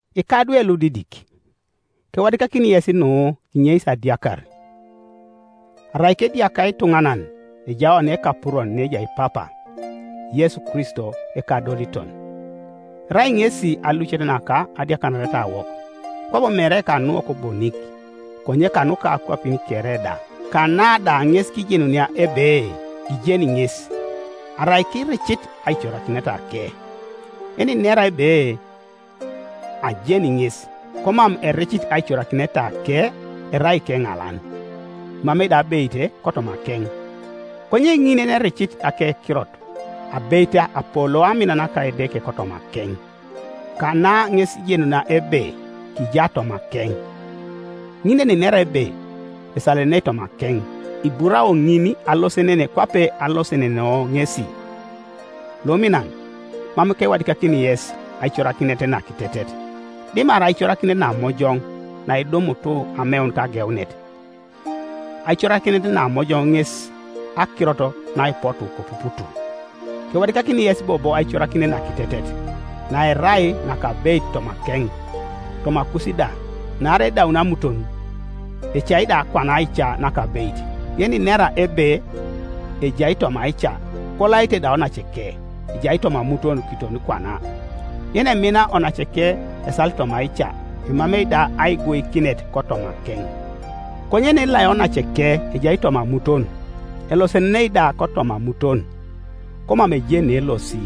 Ikadwe ludidik, kewadikakini yes nu kinyeis adiakar. Arai kediaka ituŋanan ejai oni Ekapuron neejai Papa, Yesu Kristo ekadoliton. Erai ŋesi alucet naka adiakanaretawok, kwabo mere kanuwok bonik, konye kanuka akwapin kere da. Kana da ŋes kijenunia ebe kijeni ŋes, arai kiricit aicorakinetake. Yeninera ebe, “Ajeni ŋes,” komam ericit aicorakinetake erai ikeŋalan, emamei da abeit kotomakeŋ. Konye ŋin yenericit akekirot abeit apoloo amin naka Edeke kotomakeŋ. Kana ŋes kijenunia ebe kija tomakeŋ. Ŋin yeninera ebe esalenenei tomakeŋ, iburao ŋin alosenen kwape alosenenoo ŋesi. Luminan, mam kewadikakini yes aicorakinet nakitetet, dimarai aicorakinet namojoŋ naidumut ameun kageunet; aicorakinet namojoŋ ŋes akirot naipotu kopuput. Kewadikakini yes bobo aicorakinet nakitetet, naerai nakabeit tomakeŋ, tomakus da, naarai edaun amuton, ecai da kwana aica nakabeit. Yeninera ebe ejai toma aica, kolaite da onaceke, ejai toma amuton kiton kwana. Yenemina onaceke esalit toma aica, emamei da aiguikinet kotomakeŋ. Konye yenelai onaceke ejai toma amuton, elosenenei da kotoma amuton, komam ejeni neelosi,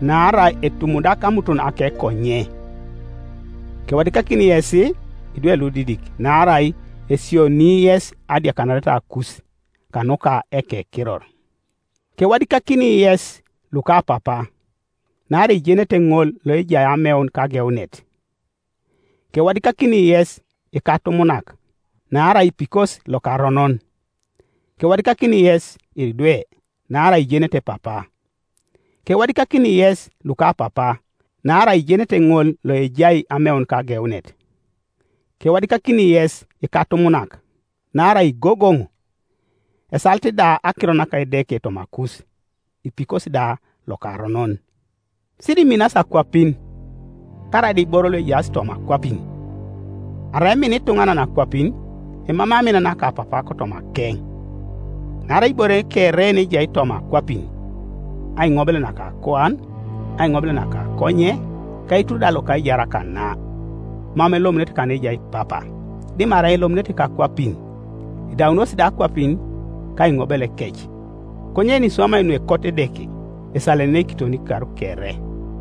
naarai etumudak amuton akekonye. Kewadikakini yes, idwe ludidik, naarai esionii yes adiakanaretakus, kanuka ekekiror. Kewadikakini yes, lukapapa, naarai ijenete ŋol loejai ameun kageunet. Kewadikakini yes, ikatumunak, naarai ipikos lokaronon. Kewadikakini yes, idwe, naarai ijenete Papa. Kewadikakini yes, lukapapa, naarai ijenete ŋol Ioejai ameun kageunet. Kewadikakini yes, ikatumunak, naarai igogoŋ, esalit da akirot naka Edeke tomakus, ipikos da lokaronon. Siriminas akwapin, karaida iboro luejaas toma akwapin. Arai emina ituŋanan akwapin, emamei amin naka Papa kotomakeŋ. Naarai ibore kere yenejai toma akwapin, aiŋobel naka akuan, aiŋobel naka akonye, ka eitur da loka aijar kana, mam elomunete kaneejai Papa, dimarai elomunete kakwapin. Edaunos da akwapin, ka aiŋobelekec; konye yeniswamai nuekot Edeke esalenenei kiton ikar kere.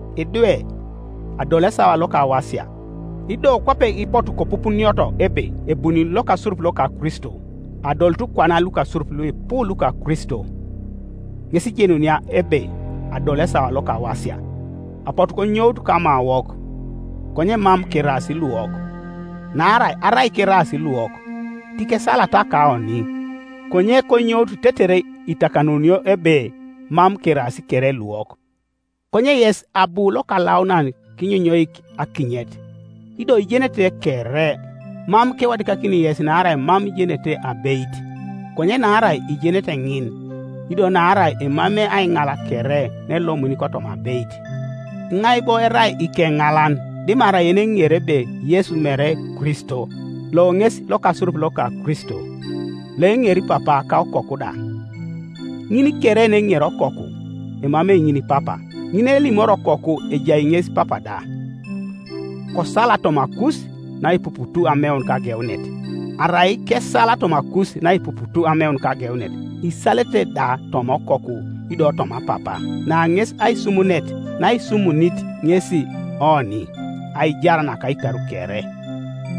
Idwe, adolu esawa lokawasia, ido kwape ipotu kopupunioto ebe ebuni lokasurup loka Kristo, adolut kwana lukasurup luipu luka Kristo; ŋes kijenunia ebe adolu esawa lokawasia. Apotu konyout kamawok, konye mam keraas luwok; naarai arai keraas luwok, tikesalata kaoni, konye konyout tetere itakanunio ebe mam keraas kere luwok. Konye yes abu Lokalaunan kinyonyoik akinyet, ido ijenete kere. Mam kewadikakini yes naarai mam ijenete abeit, konye naarai ijenete ŋin, ido naarai emamei aiŋal kere naelomuni kotoma abeit. Iŋai bo erai ikeŋalan dimarai yeneŋeri ebe Yesu mere Kristo? Lo ŋes lokasurup loka Kristo, loeŋeri Papa ka Okoku da. Ŋin kere yeneŋeri Okoku, emamei ŋin Papa. Ŋin yenelimori Okoku ejai ŋes Papa da. Kosal tomakus naipuput ameun kageunet. Arai kesal tomakus naipuput ameun kageunet, isalete da toma Okoku ido toma Papa, Na ŋes aisumunet naisumunit ŋesi oni, aijar naka ikar kere.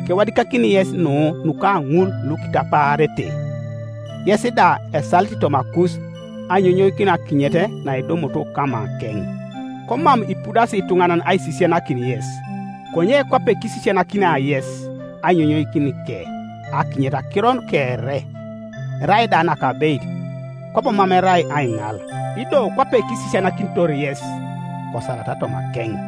Kewadikakini yes nu nuka ŋul lukitapaarete. Yes da, esalit tomakus ainyonyoikinio akinyet naidumut kamakeŋ, komam ipudasi ituŋanan aisisianakin yes; konye kwape kisisianakinia yes ainyonyoikinike akinyet akiro kere, erai da nakabeit, kwabo mam erai aiŋal, ido kwape kisisianakinitor yes, kosalata tomakeŋ.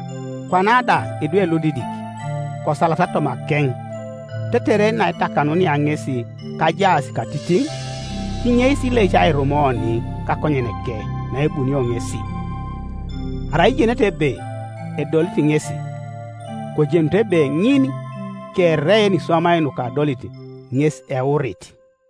Kwana da, idwe ludidik, kosalata tomakeŋ, tetere naetakanunia ŋesi kajaas katitiŋ, kinyeis ileic airum oni kakonyeneke naebunio ŋesi. Arai ijenete ebe edolit ŋesi, kojenut ebe ŋin kere yeniswamai nukadolit ŋes eurit,